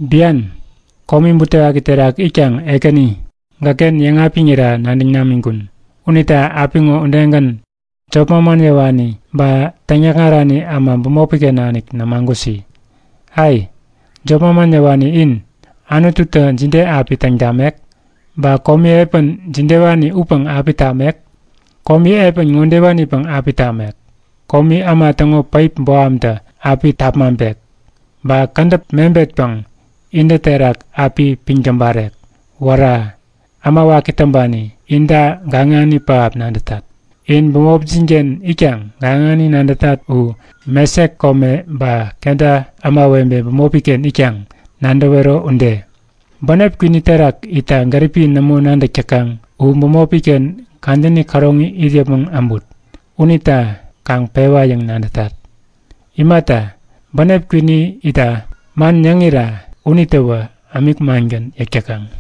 Bian, komi butewaki terak itkaŋ Ekäni, gäkken yäŋapiŋira nadäŋ namiŋkun. Unita apiŋo udegän jop manman yäwani ba täŋyäkŋarani äma bämopiken nanik nämagusi! Ai, jop manman yäwani in, Anututä jide api täŋ tamek? Ba komi epän jidewani upäŋ api tamek? Komi epän ŋodewanipäŋ api tamek; Komi äma täŋo päip bohamtä api tapmaŋpek. Ba kädäp mebetpäŋ intä terak api piŋ täbarek. Wära! Äma waki täŋpani, inta gaŋani pähap nadätat! In bämopjinken itkaŋ gaŋani nadätat u Mesek kome ba Keda ämawebe bämopiken itkaŋ nadäwero ude. Bänep kwini terak itta gäripi nämo nadäk täkaŋ u bämopiken kadäni käroŋi it yäpmäŋ äbut. Unita kaŋ pewa yäŋ nadätat. Imata, bänep kwini itta man yäŋira unitäwä ämik mangän yäk täkaŋ.